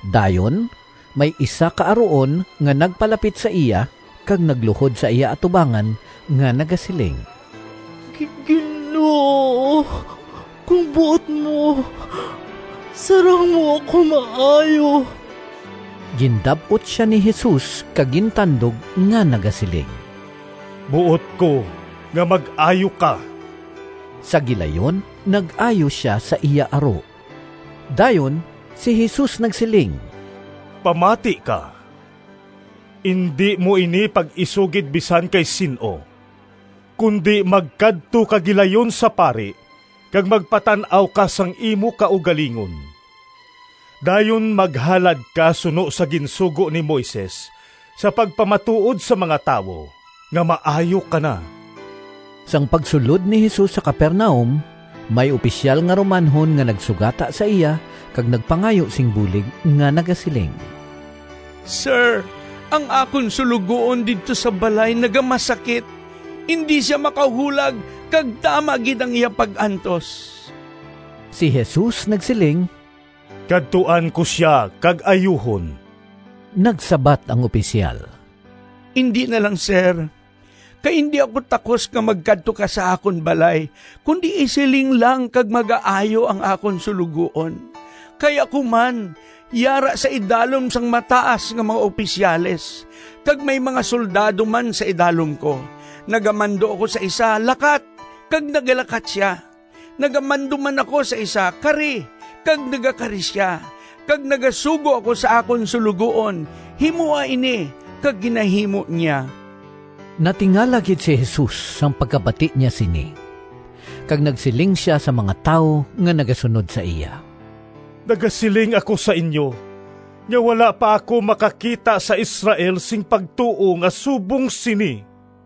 Dayon may isa ka aruon nga nagpalapit sa iya, kag nagluhod sa iya atubangan nga nagasiling, “Ginoo kon buot mo, sarang mo ako maayo.” Gindab-ot sia ni Jesus kag gintandog nga nagasiling, “Buot ko nga mag-ayo ka!” Sa gilayon nag-ayo sia sa iya aro. Dayon si Jesus nagsiling, “Pamati ka! Indi mo ini pag-isugid bisan kay sin-o, kundi magkadto ka gilayon sa pari kag magpatan-aw ka sang imo kaugalingon. Dayon maghalad ka suno sa ginsugo ni Moises sa pagpamatuod sa mga tawo nga maayo ka na.” Sang pagsulod ni Jesus sa Capernaum, may opisyal nga Romanhon nga nagsugata sa iya kag nagpangayo sing bulig nga nagasiling, “Sir, ang akon suloguon didto sa balay nagamasakit; indi sia makahulag kag tama gid ang iya pag-antos.” Si Jesus nagsiling, “Kadtuan ko sia kag ayuhon.” Nagsabat ang opisyal, “Indi na lang, Sir, kay indi ako takos nga magkadto ka sa akon balay, kundi isiling lang kag magaayo ang akon suloguon. Kay ako man yara sa idalom sang mataas nga mga opisyales, kag may mga soldado man sa idalom ko; nagamando ako sa isa, ‘Lakat!’ kag nagalakat sia; nagamando man ako sa isa, ‘Kari!’ kag nagakari sia; kag nagasugo ako sa akon suloguon, ‘Himoa ini!’ kag ginahimo niya.” Natingala gid si Jesus sang pagkabati niya sini, kag nagsiling sia sa mga tawo nga nagasunod sa iya, “Nagasiling ako sa inyo nga wala pa ako makakita sa Israel sing pagtuo nga subong sini.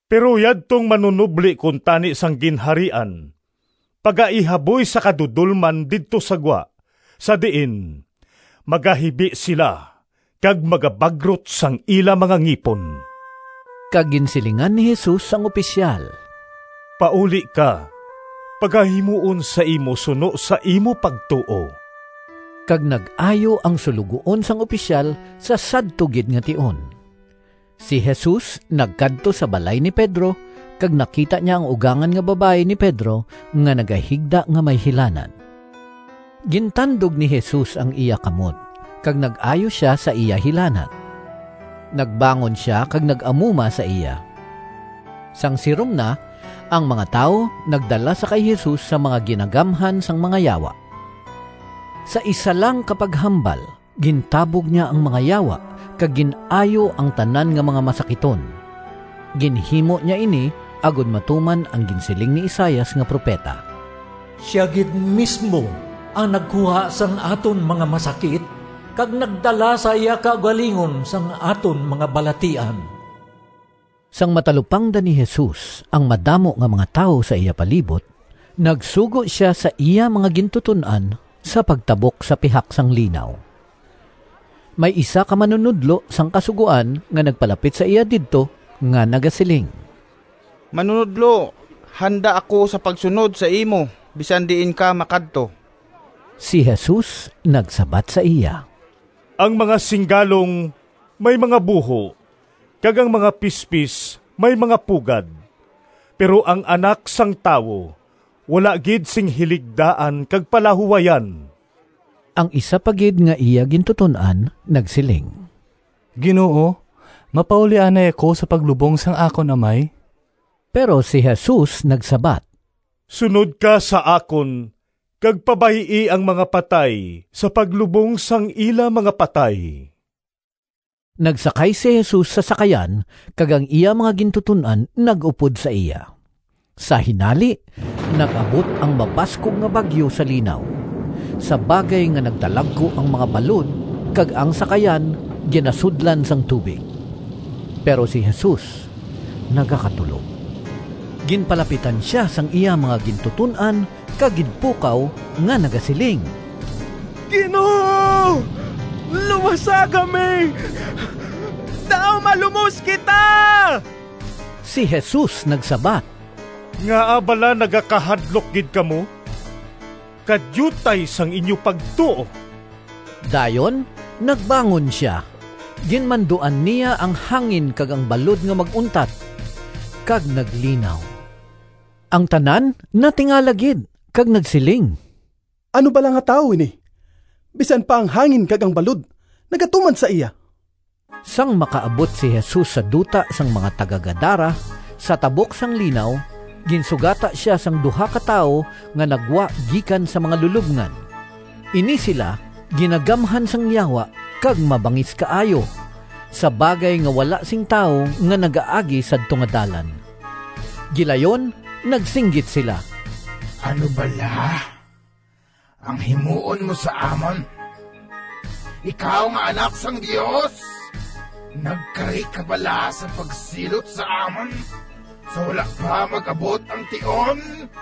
Pero yadtong manunobli kuntani sang Ginharian pagaihaboy sa kadudolman didto sa gwa, sa diin magahibi sila kag magabagrot sang ila mga ngipon.” Kag ginsilingan ni Jesus ang opisyal, “Pauli ka, pagahimuon sa imo suno sa imo pagtuo.” Kag nag-ayo ang suloguon sang opisyal sa sadto gid nga tion. Si Jesus nagkadto sa balay ni Pedro, kag nakita niya ang ugangan nga babayi ni Pedro nga nagahigda nga may hilanat. Gintandog ni Jesus ang iya kamot kag nag-ayo sia sa iya hilanat. Nagbangon sia kag nag-amuma sa iya. Sang sirom na, ang mga tawo nagdala sa kay Jesus sang mga ginagamhan sang mga yawa. Sa isa lang ka paghambal gintabog niya ang mga yawa kag gin-ayo ang tanan nga mga masakiton. Ginhimo niya ini agod matuman ang ginsiling ni Isaias nga propeta, “Sia gid mismo ang nagkuha sang aton mga masakit kag nagdala sa iya kaugalingon sang aton mga balatian.” Sang matalupangdan ni Jesus ang madamo nga mga tawo sa iya palibot, nagsugo sia sa iya mga gintuton-an sa pagtabok sa pihak sang linaw. May isa ka manunodlo sang Kasugoan nga nagpalapit sa iya didto nga nagasiling, “Manunodlo, handa ako sa pagsunod sa imo bisan diin ka makadto.” Si Jesus nagsabat sa iya, “Ang mga singgalong may mga buho, kag ang mga pispis may mga pugad, pero ang Anak sang Tawo wala gid sing hiligdaan kag palahuwayan.” Ang isa pa gid nga iya gintuton-an nagsiling, “Ginoo, mapauli anay ako sa paglubong sang akon amay.” Pero si Jesus nagsabat, “Sunod ka sa akon kag pabay-i ang mga patay sa paglubong sang ila mga patay.” Nagsakay si Jesus sa sakayan kag ang iya mga gintuton-an nag-upod sa iya. Sa hinali nag-abot ang mabaskog nga bagyo sa linaw, sa bagay nga nagdalagku ang mga balod kag ang sakayan ginasudlan sang tubig. Pero si Jesus nagakatulog. Ginpalapitan sia sang iya mga gintuton-an kag ginpukaw nga nagasiling, “Ginoo, luwasa kami! Daw malumos kita!” Si Jesus nagsabat, “Ngaa bala nagakahadlok gid kamo? Kadiutay sang inyo pagtuo!” Dayon nagbangon sia, ginmanduan niya ang hangin kag ang balod nga mag-untat, kag naglinaw. Ang tanan natingala gid kag nagsiling, “Ano bala nga tawo ini? Bisan pa ang hangin kag ang balod nagatuman sa iya!” Sang makaabot si Jesus sa duta sang mga taga-Gadara, sa tabok sang linaw, ginsugata sia sang duha ka tawo nga naggwa gikan sa mga lulobngan. Ini sila ginagamhan sang yawa kag mabangis kaayo, sa bagay nga wala sing tawo nga nagaagi sadto nga dalan. Gilayon nagsinggit sila, “Ano bala ang himuon mo sa amon, ikaw nga Anak sang Dios? Nagkari ka bala sa pagsilot sa amon sa wala pa mag-abot ang tion?”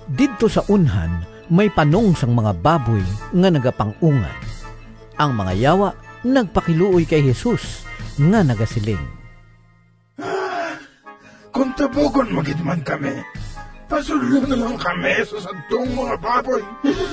Didto sa unhan may panong sang mga baboy nga nagapang-ungad. Ang mga yawa nagpakiluoy kay Jesus nga nagasiling, “Kon tabugon mo gid man kami, pasudla na lang kami sa sadtong mga baboy.”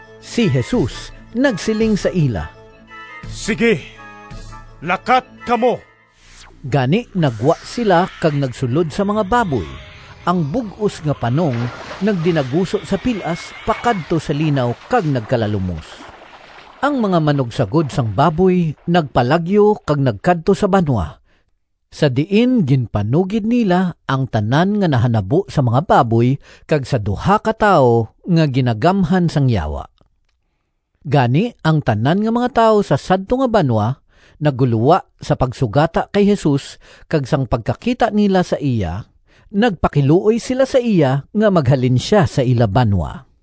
Si Jesus nagsiling sa ila, “Sigi, lakat kamo!” Gani naggwa sila kag nagsulod sa mga baboy. Ang bug-os nga panong nagdinaguso sa pil-as pakadto sa linaw kag nagkalalumos. Ang mga manugsagod sang baboy nagpalagyo kag nagkadto sa banwa, sa diin ginpanugid nila ang tanan nga nahanabo sa mga baboy kag sa duha ka tawo nga ginagamhan sang yawa. Gani ang tanan nga mga tawo sa sadto nga banwa naggulowa sa pagsugata kay Jesus, kag sang pagkakita nila sa iya, nagpakiluoy sila sa iya nga maghalin sia sa ila banwa.